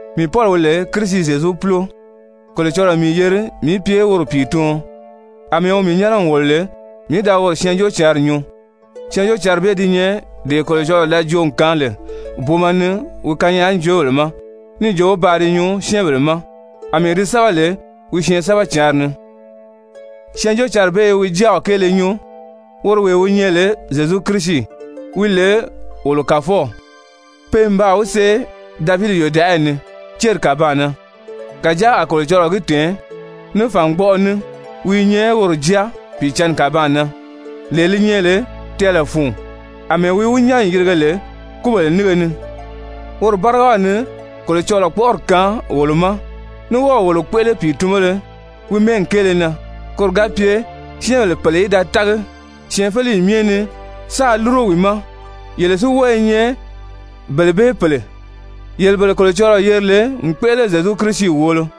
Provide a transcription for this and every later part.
Mii Pɔli, wi lè Kirisi Zyezu púlo, Kolocɔlɔɔ n mii yeri mii í pye woro pìituɔn àmɛɛ wi mii nyɛ́nɛ n wòlo lè mii í da woro Syɛɛnjóocǎnri nyuu. Syɛɛnjóocǎnri bee di nyɛ dee Kolocɔlɔɔ da joo n kaan lè booma ni wi kanyaajoobèle ma níì jo paa di nyuu syɛ́ɛnbèle ma, àmɛɛ di sɛ́bɛ lè wi syɛɛnsɛbɛcǎnri ni. Syɛɛnjóocǎnri bee i wi Jáaw kéele nyuu, woro wee wi nyɛ lè Zyezu Kirisi, wi lè wolo Kàfɔw, pe n baa wi see Davidi yòdaʔayi ni céri kàbaan na, kàjáa a Kolocɔlɔɔ gi tɛ̀ɛn ní fàngbɔʔɔ ní wi i nyɛ woro Jáa Pìicǎnni kàbaan na, lee li nyɛ lè tɛɛlɛ fun, àmɛɛ wi wi nyán n yirige lè kúbèle nínge ni. Woro bárigaw ni Kolocɔlɔɔ kpɔ́ʔɔri kaan wolo ma, ní wɔ́ɔ̀ wolo kpéʔele pìitunbéle wi mɛ́ɛgi kéele na, koro ga pye syɛ́ɛnbèle pèle í da tági syɛɛnfeleyi myɛ ni sáā lúro wi ma, yele si wɔ́ɔ i nyɛ bele bee pèle, yele bele Kolocɔlɔɔ yeri lè n kpéʔele Zyezu Kirisi wòolo.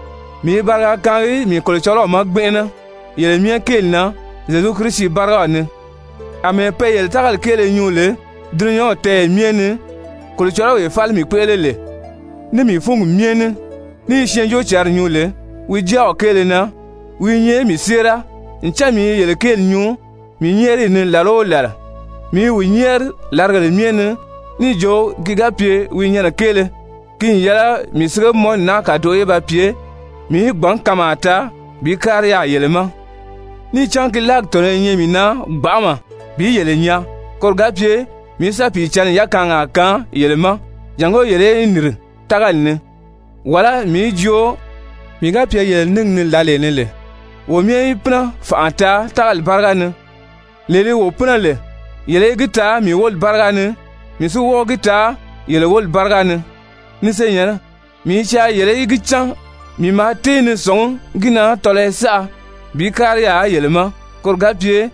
Mii i bariga kaangi mii Kolocɔlɔw ma gbɛnʔɛnɛ yele myɛ kéeli na Zyezu Kirisi bárigaw ni, àmɛɛ pe yele tágali kéele nyuu lè dulunyanw tɛ́ɛyɛ myɛ ni. Kolocɔlɔwee fáli mii kpéʔele lè ní mii fúngi myɛ ní ní i Syɛɛnjóocǎnri nyuu lè wi Jáaw kéele na, wi i nyɛ mii séera ncan mii i yele kéeli nyuu mii nyɛ́ɛriyi ni làla o làla. Mii i wi nyɛ́ɛri làrigèle myɛ ni níì jo, ki ga pye wi nyɛnɛ kéele ki n yɛlɛ mii sigemɔnni naa kàdoʔo í ba pye mii í gbǎn kanmaa taa bi kári yaà yele ma. Níì cán ki láagi tɔ̀nɔ́ i nyɛ mii na gbanʔama bi yele nyaa koro ga pye mii í sa Pìicǎnni yakaangaa kaan yele ma, jàngó yele í nìri tágali ni, wàlá mii í joo mii ga pye yele níngi ni lǎlee ni lè, wo myɛ í pínɛ fànʔa taa tágali báriga ni, lee li wo pínɛ lè, yele í gi taa mii wóli báriga ni, mii si wɔ́ɔ gi taa yele wóli báriga ni. Ni senyɛ̀nnɛ, mii i caa yele í gi cán mii maa tée ni sɔ̀ngí gi na tɔlɔyɔ saʔa bi kári yaà yele ma koro ga pye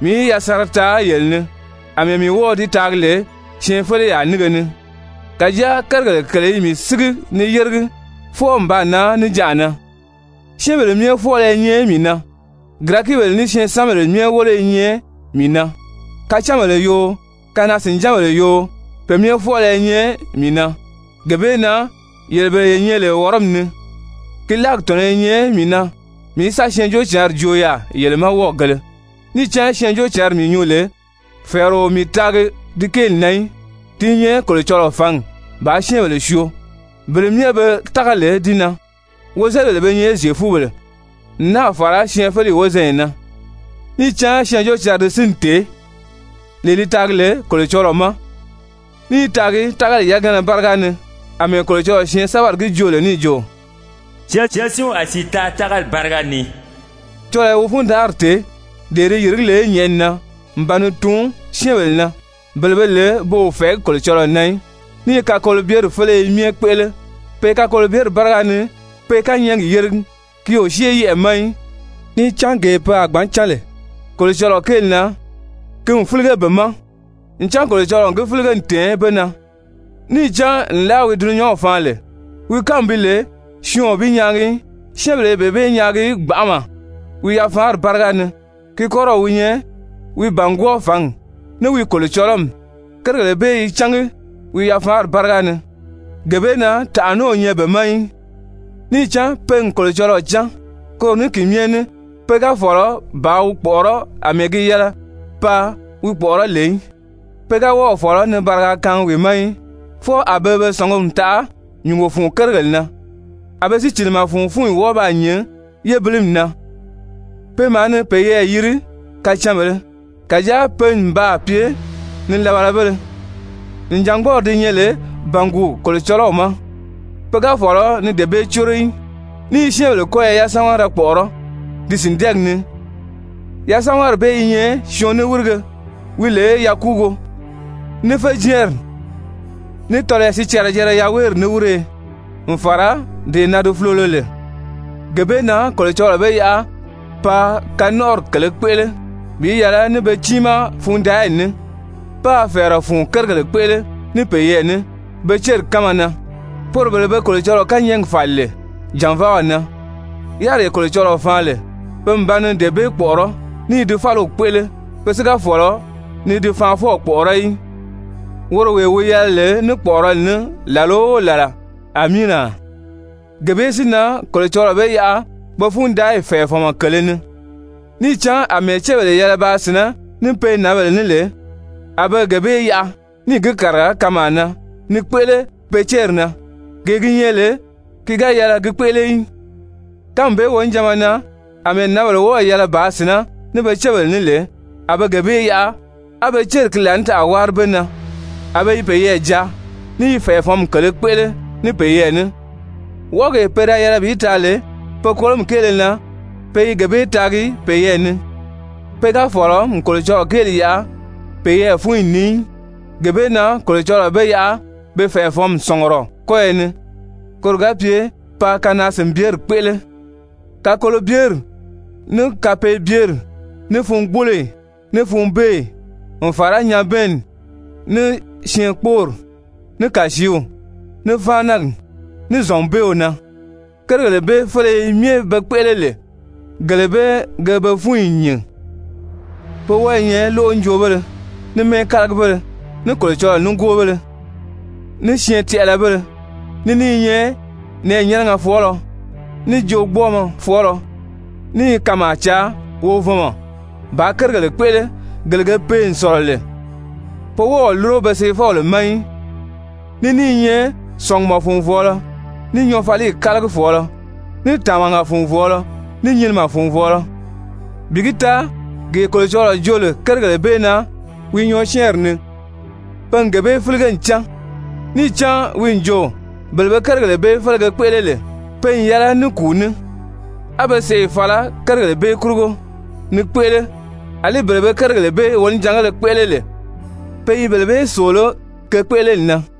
mii í yasanra taa yele ni, àmɛɛ mii wɔ́ɔ̄ di taagi lè syɛɛnfeleyaa nínge ni. Kàjáa kérigèle kèle i mii sígi ni yéregi fwɔɔ n baa nan níjanʔa na. Syɛ́ɛnbèle myɛ fwɔ́ɔlɔ i nyɛ mii na, Girɛkibèle ní syɛɛnsanbèle myɛ wólo i nyɛ mii na, kacánbèle yoo, kanaa-sìnjánbèle yoo, pe myɛ fwɔ́ɔlɔ i nyɛ mii na. Gee bee na, yele bele ye nyɛ lè Wɔrɔmi ni, ki láagi tɔ̀nɔ́ i nyɛ mii na mii í sa Syɛɛnjóocǎnri joo yaà yele ma wɔ́ɔgēle. Níì cán Syɛɛnjóocǎnri mii nyuu lè, fɛ̀ɛrɛ o mii taagi di kéeli na í, ti i nyɛ Kolocɔlɔɔ fǎngi bàā syɛ́ɛnbèle syoo, bele myɛ be tági lè di na, wozelibèle be nyɛ Zyefubèle n náà fàra syɛɛnfeleyi wozanya na. Níì cán Syɛɛnjóocǎnri di sínni tèé, lee li taagi lè Kolocɔlɔɔ ma, ní i taagi tágali yagana báriga ni, àmɛɛ Kolocɔlɔɔ syɛɛnsɛbɛri gi joo lè níì jo: «Syɛɛnsinw a sìi taa tágali báriga ni.» Kolocɔlɔɔ i wi fundanʔari tèé, dee di yìrigí lè nyɛ̀ʔɛni na n ba ni tuun syɛ́ɛnbèle na, bele be lè pe o fɛ̀ɛgí Kolocɔlɔɔ na í, ní i kakolobyeri féleye myɛ kpéʔele, pe kakolobyeri báriga ni pe kányɛɛgi yéregi, ki o syée yɛʔɛ̀ ma í. Níì cán gee pe a gbǎn cán lè Kolocɔlɔɔ kéeli na, ki n fílige be ma. Ncan Kolocɔlɔɔ n gi fílige n tɛ̀ɛn be na. Níì cán nlaa wi dulunyanw faan lè, wi kánmi bi lè syɔɔn o bi nyaagi í, syɛ́ɛnbèle i bee bee nyaagi gbanʔama wi yafaanri báriga ni, ki kɔ́rɔw wi nyɛ wi bàngwɔɔ fǎngi, ní wi kolocɔlɔmi, kérigèle bee i cángi wi yafaanri báriga ni. Gee bee na tànʔa ní o nyɛ be ma í, níì cán pe n Kolocɔlɔɔ cán, koro ní ki myɛ ní pe ga fɔ̀lɔ bàā wi kpɔ̀ʔɔrɔ́ àmɛɛ gi yɛlɛ paa wi kpɔ̀ʔɔrɔ́ lè í, pe ga wɔ́ɔ̀ fɔ̀lɔ ni bariga kaangi wi ma í. Fwɔɔ a be be sɔ̀nguri taʔa nyùngo fun kérigèle na, a be sícilimɛ fun fúnyi wɔ́ɔ baa nyìn yébilimi na. Pe maa ni peyɛɛ yiri kacanbèlē, kàjáa pe n baa pye nilabalabéle. Nìjangbɔɔri di nyɛ lè bànguu Kolocɔlɔw ma, pe ga fɔ̀lɔ ni dee bee córo í, ní i syɛ́ɛnbèle kɔ́yɔ yasamagara kpɔ̀ʔɔrɔ́ ti sìndɛɛgi ni, yasamagari bee i nyɛ syɔɔn niwirige wi lè yakuugo, ní féjɛɛnri, ní tɔlɔyɔ sicɛrɛ-jɛrɛ yaweeri niwiriye n fàra dee na di fulolo lè. Gee bee na Kolocɔlɔɔ be yaʔa paa kanɔnʔɔri kèlē kpéʔele bi yɛlɛ ní be tiimaa fundaayi ní, páā fɛ̀ɛrɛ fun kérigèle kpéʔele ní peyɛɛ ní pe céri kánma na, poro bele be Kolocɔlɔɔ kányɛɛgi fàli lè jànvaaw na. Yáriree Kolocɔlɔɔ faan lè, pe n ba ni dee bee kpɔ̀ʔɔrɔ́ ní i di fáliw kpéʔele. Pe si ga fɔ̀lɔ ni di Faanfɔw kpɔ̀ʔɔrɔ́ í, woro wee wi yɛlɛ lè ní kpɔ̀ʔɔrɔli ní làla o làla. Amiina! Gee bee si na Kolocɔlɔɔ be yaʔa pe fundaayi fɛ̀ɛfɔnmɔ kèlē ni, níì cán àmɛɛ cébèle yɛlɛ bàā sìnɛ́ ní pe nǎnbèle ní lè, a be gee bee yaʔa níì gi kàriga kanmaa na ni kpéʔele pe céri na, gee gi nyɛ lè ki ga yɛlɛ gi kpéʔele í. Kánmi bee wonijanma na, àmɛɛ nǎnbèle wɔ́ɔ̀ yɛlɛ bàā sìnɛ́ ní pe cébèle ní lè, a be gee bee yaʔa, á be céri láanitaʔa wári be na, a be i peyɛɛ jaa, ní i fɛ̀ɛfɔnmi kèlē kpéʔele ní peyɛɛ ní. Wɔʔɔgee pe yɛlɛ bi taa lè pe kolomi kéele na, pe i gee bee taagi peyɛɛ ni. Pe ga fɔ̀lɔ n Kolocɔlɔɔ kéeli yaʔa peyɛɛ fúnyi ni í, gee bee na Kolocɔlɔɔ be yaʔa be fɛ̀ɛfɔnmi sɔ̀ngurɔ kɔ́yɔ ni, koro ga pye paa kanaa-sìnbyeri kpéʔele. Kakolobyeri, ní kapeebyeri, ní fungboloyi, ní funbeeyi, n fàra nyabɛɛnni, ní syɛɛnkpoori, ní kàsiiw, ní fáanagi, ní zɔ̀nbeew na, kérigèle bee féleye myɛ be kpéʔele lè, gele bee ge be fúnyi nyìn. Pe wɔ́ɔ i nyɛ lóʔonjoobéle, ní mɛ́ɛkalagibéle, ní Kolocɔlɔɔ nígoobéle, ní syɛɛn-tɛʔɛlɛbéle, ní ní i nyɛ nɛ̀ɛnyɛnɛgɛ fɔɔlɔ, ní joogbɔɔmɔ fɔɔlɔ, ní i kanmaa caa wovɔnmɔ bàā kérigèle kpéʔele, gele ge pee n sɔ̀lɔ lè, pe wɔ́ɔ o lúro pe seefɔbèle ma í, ní ní i nyɛ sɔ̀ngumɔ-fùnvɔɔlɔ, ní nyɔɔfaliyi kálagifɔɔlɔ, ní tàmaga-fùnvɔɔlɔ, ní nyinimɛ-fùnvɔɔlɔ. Bi gi taa gee Kolocɔlɔɔ joo lè kérigèle bee na wi nyɔɔsyɛɛnri ni, pe n gee bee fílige n cán, níì cán wi n jo: Bele be kérigèle bee félege kpéʔele lè, pe n yɛlɛ ní kùu ní, a be sèʔê fala kérigèle bee kurugo ni kpéʔele, àlí bele be kérigèle bee wonijangéle kpéʔele lè, pe i bele bee sòoló ke kpéʔeleli na.